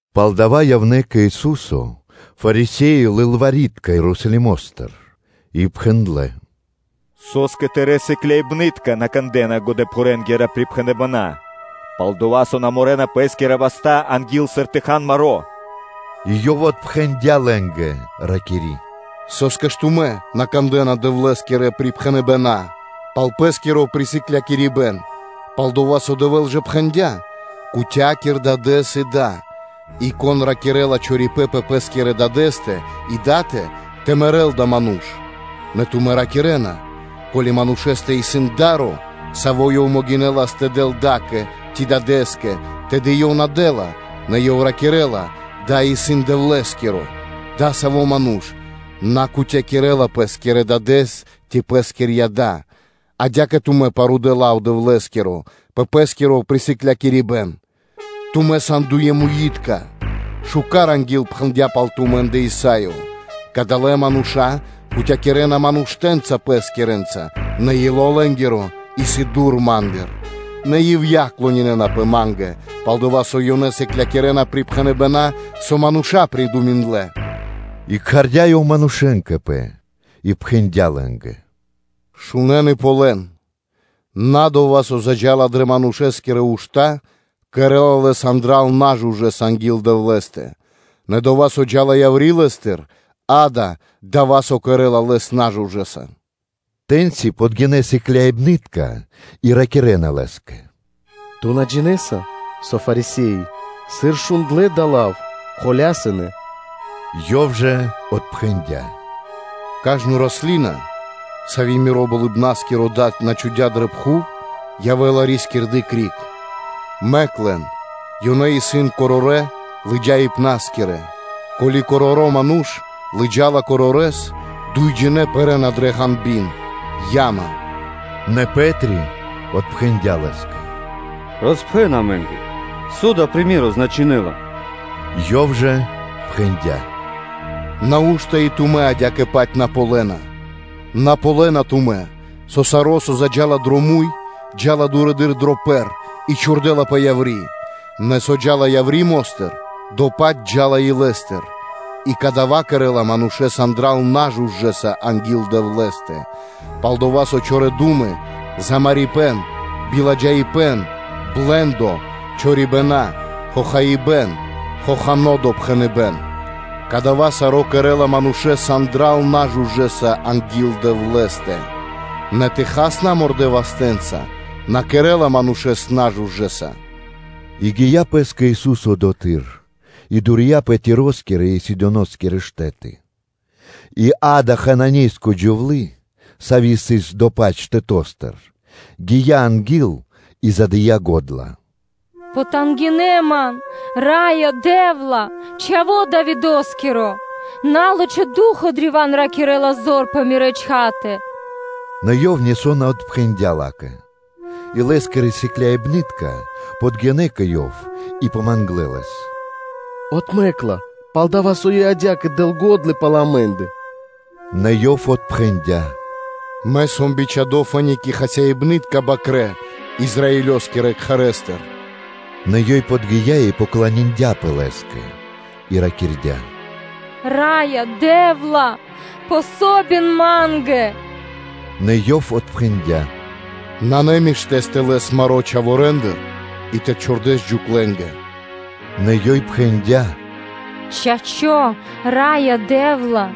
Пало́ дава́ явнэ́ кэ Ису́со Фарисе́и и лылвари́тка Ерусалимо́стыр и пхэндлэ́: “Со́скэ Тырэ́ сыкляибны́тка на кандэ́на годэпхурэнгирэ припхэныбэна́? Пал-дова́ со на морэна пэ́скирэ васта́, анги́л сыр тэ хан маро́.” И Ёв отпхэндя́ лэ́нгэ, ракири́: “Со́скэ ж тумэ́ на кандэ́на Дэвлэ́скирэ припхэныбэна́ пал пэ́скиро присыклякирибэн? Палдова́ со Дэвэ́л ж пхэндя́: ‘Кутякир дадэ́с и да’, и, ‘Кон ракирэ́ла чорипэ́н пэ пэ́скирэ Дадэ́стэ и датэ, тэ мэрэ́л адава́ ману́ш.’ Нэ тумэ́ ракирэ́на: Ко́ли манушэ́стэ исын да́ро, саво́ ёв могинэлас тэ дэл дадэ́скэ ци да́кэ, тэды ёв на дэ́ла, нэ ёв ракирэ́ла: ‘Дава́ исын Дэвлэ́скиро’, адасаво́ ману́ш на кутякирэла пэ́скирэ дадэ́с ци пэскирья́ да. Адя́кэ тумэ́ парудэ лав Дэвлэ́скиро пэ пэ́скиро присыклякирибэн. Тумэ́ сан, дуемуитка! Шука́р ангилпхэндя пал тумэ́ндэ Исаё: ‘Кадалэ́ мануша́ кутякирэна Ман уштэ́нца пэскирэнца, нэ ило́ лэ́нгиро исын дур Ма́ндыр; нэ ивья́ (напра́снэс) клонинэнапэ Ма́нгэ, пал-дова́ со ёнэ сыклякирэ́на припхэныбэна́, со мануша́ придуминдлэ.’ И кхардя́ Ёв манушэ́н кэ Пэ, и пхэндя́ лэ́нгэ: “Шунэ́н и ґалён: ‘На дова́, со заджа́ла дрэ манушэ́скирэ ушта́, кэрэ́ла Лэс магирдэса анги́л Дэвлэ́стэ, нэ дова́, со джа́ла яври́ лэ́стыр, акэ, исын, дава́, со кэрэ́ла Лэс магирдэса.” Тэ́ньци подгинэ́ сыкляибны́тка и ракирэ́на Лэ́скэ: “Ту на джинэ́са, со Фарисе́и, сыр шундлэ́ дава́ лав, мэкнэ́ тэ патя́н Ту́кэ?” Ёв жа отпхэндя́: “Кажно раслина, сави́ Миро Болыбна́скиро Дад на чхудя́ дрэ пхув, явэ́ла рискирды корне́нца (рукхэ́нца). Мэк лэн; ёнэ исын корорэ́ лыджаибна́скирэ. Ко́ли короро́ ману́ш лыджа́ла корорэс, дуйджинэ́ пэрэ́на дрэ ґанби́н (яма).” Нэ Пэ́три отпхэндя́ Лэ́скэ: “Роспхэн амэ́нгэ, со дава́ приме́ро значынэ́ла” Ёв жа пхэндя́: “Нау́што и тумэ́ адя́кэ-паць на ґалёна? На ґалёна тумэ́, со саро́, со заджа́ла дро муй, джа́ла дурэды́р дро пэр и чхурдэлапэ яври́? Нэ со джа́ла яври́ мо́стыр, дова́-паць джа́ла илэ́стыр, и кадава́ кэрэ́ла манушэ́с магирдэса. Палдова́ со чорэ́ ду́мы, замарибэн, биладжаипэ́н, блэ́ндо, чорибэна, хохано́ допхэныбэ́н, калякирибэн. Кадава́ саро́ кэрэ́ла манушэ́с магирдэса анги́л Дэвлэ́стэ, нэ тэ хал намордэ вастэ́нца на кэрэ́ла манушэ́с магирдэса.” И гия́ пэ́скэ Ису́со одотхы́р и дурия пэ Тироскирэ и Сидоноскирэ штэ́ты; и, акэ, Хананеенгири джувлы́, сави́ сыс до-паць штэто́стыр, гия́ анги́л и задыя го́дла: “Потангинэ (пожалин) ман, Раё Дэ́вла, Чхаво́ Давидо́скиро, на́лачхо ду́хо (фа́но) древа́н рикирэ́ла зор пэ мирэ́ чхатэ.” Нэ Ёв нисо́ на отпхэндя́ ла́кэ. И Лэ́скирэ сыкляибны́тка подгинэ́ кэ Ёв и помангнэ Лэс: “Отмэк ла, пал-дова́ со ёй адя́кэ дэ́ла го́дла пал амэ́ндэ.” Нэ Ёв отпхэндя́: “Мэ сом бичхадо́ фэ́ни кэ хасибны́тка бакрэ́ Израилёскирэ кхэрэ́стыр.” Нэ ёй подги́я и поклониндяпэ Лэ́скэ и ракирдя́: “Раё Дэ́вла! Помогин ма́нгэ!” Нэ Ёв отпхэндя́: “Намишто тэ лэс маро́ чхаворэндыр и тэ чхурдэс джуклэнгэ.” Нэ ёй пхэндя́: “Чачо́, Раё Дэ́вла;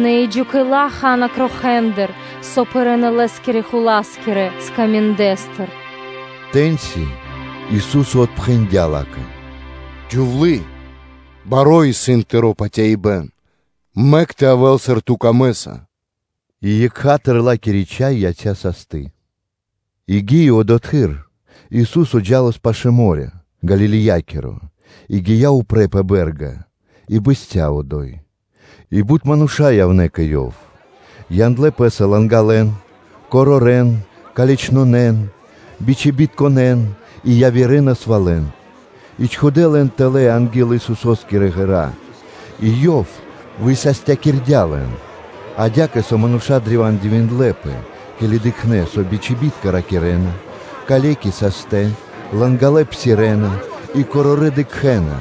нэ и джукэла ха́на крохэндыр, со пэрэ́на лэ́скирэ-хула́скирэ скаминдэстыр.” Тэ́ньци Ису́со отпхэндя́ ла́кэ: “Джувли́е, баро́ исын тыро́ патяибэ́н; мэк тэ явэ́л, сыр ту камэ́са.” И екха́тыр ла́кири чхай яця́ састы. И гии одотхы́р, Ису́со джа́лас пашы́л мо́рё (дэрья́в) Галилеякиро и гия́ упрэ́ пэ бэ́рга и бэсця́ одо́й; и бут мануша́ явнэ́ кэ Ёв, яндлэ́ пэ́са лангалэн, корорэн, калечнонэн, бичибитконэн и явирэ насвалэн, и чхудэ́ лэн тэлэ́ анги́л Исусо́скирэ ґэра́, и Ёв высастякирдя́ лэн; адя́кэ, со мануша́ древа́н дивиндлэ́пэ, ке́ли дыкхнэ́, со бичибитка ракирэ́на, калеки састэ, лангалэ псирэ́на, и корорэ́ дыкхэ́на;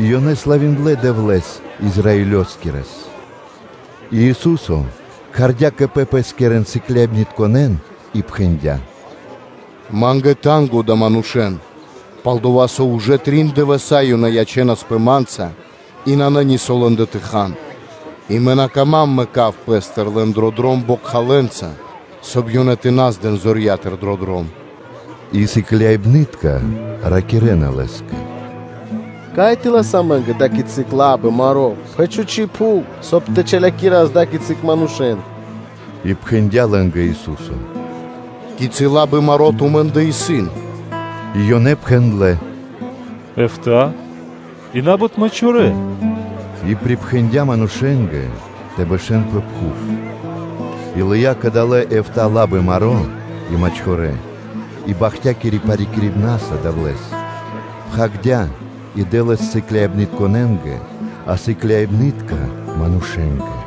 и ёнэ славиндлэ Дэвлэ́с Израилёскирэс. И Ису́со кхардя́ кэ Пэ Лэскирэн сыкляибнытконэ́н и пхэндя́: “Ма́нгэ исын танго (жалко) адалэ́ манушэ́н: пал-дова́ со ужэ трин дывэса́ ёнэ ячэнаспэ Ма́нца, и нанэ нисо́ лэ́ндэ тэ хан, и Мэ на кама́м тэ мэкав Пэ́стыр лэн дро дром бокхалэнца, соб (кай) ёнэ тэ на здэн зорья́тыр дро дром.” И сыкляибны́тка ракирэ́на Лэ́скэ: “Кай тэ лас амэ́нгэ ада́кицы лабы маро́ пэ чхучи́ пхув, соб (кай) тэ чалякирас ада́кицы манушэ́н?” И пхэндя́ лэ́нгэ Ису́со: “Кицы́ лабы маро́ тумэ́ндэ исын?” И ёнэ пхэндлэ́: “Эфта́ (битринэ́нгиро дэш) и на́бут мачхорэ.” И припхэндя́ манушэ́нгэ тэ бэшэ́н пэ пхув; и лыя́ кадалэ́ эфта́ лабы маро́ и мачхорэ, и бахтякири парикирибнаса Дэвлэ́с, роспхагирдя́, и дэ́лас сыкляибнытконэ́нгэ, а сыкляибны́тка дынэ́ манушэ́нгэ.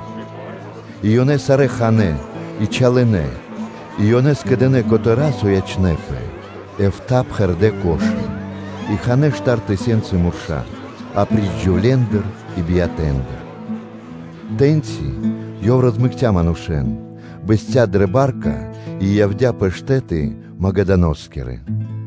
И ёнэ сарэ́ ханэ́, и чалынэ; и ёнэ скэдынэ́ котэра́, со ячнэ́пэ, эфта́ пхэрдэ́ корзи́ны (кхудэ́); и ханэ́ штар тысёнцы мурша́, апри́ч джувлендэ и биятэндэ. Тэ́ньци Ёв розмэкця манушэ́н, бэсця́ дрэ ба́рка и явдя́ пэ штэ́ты Магдалиноскирэ.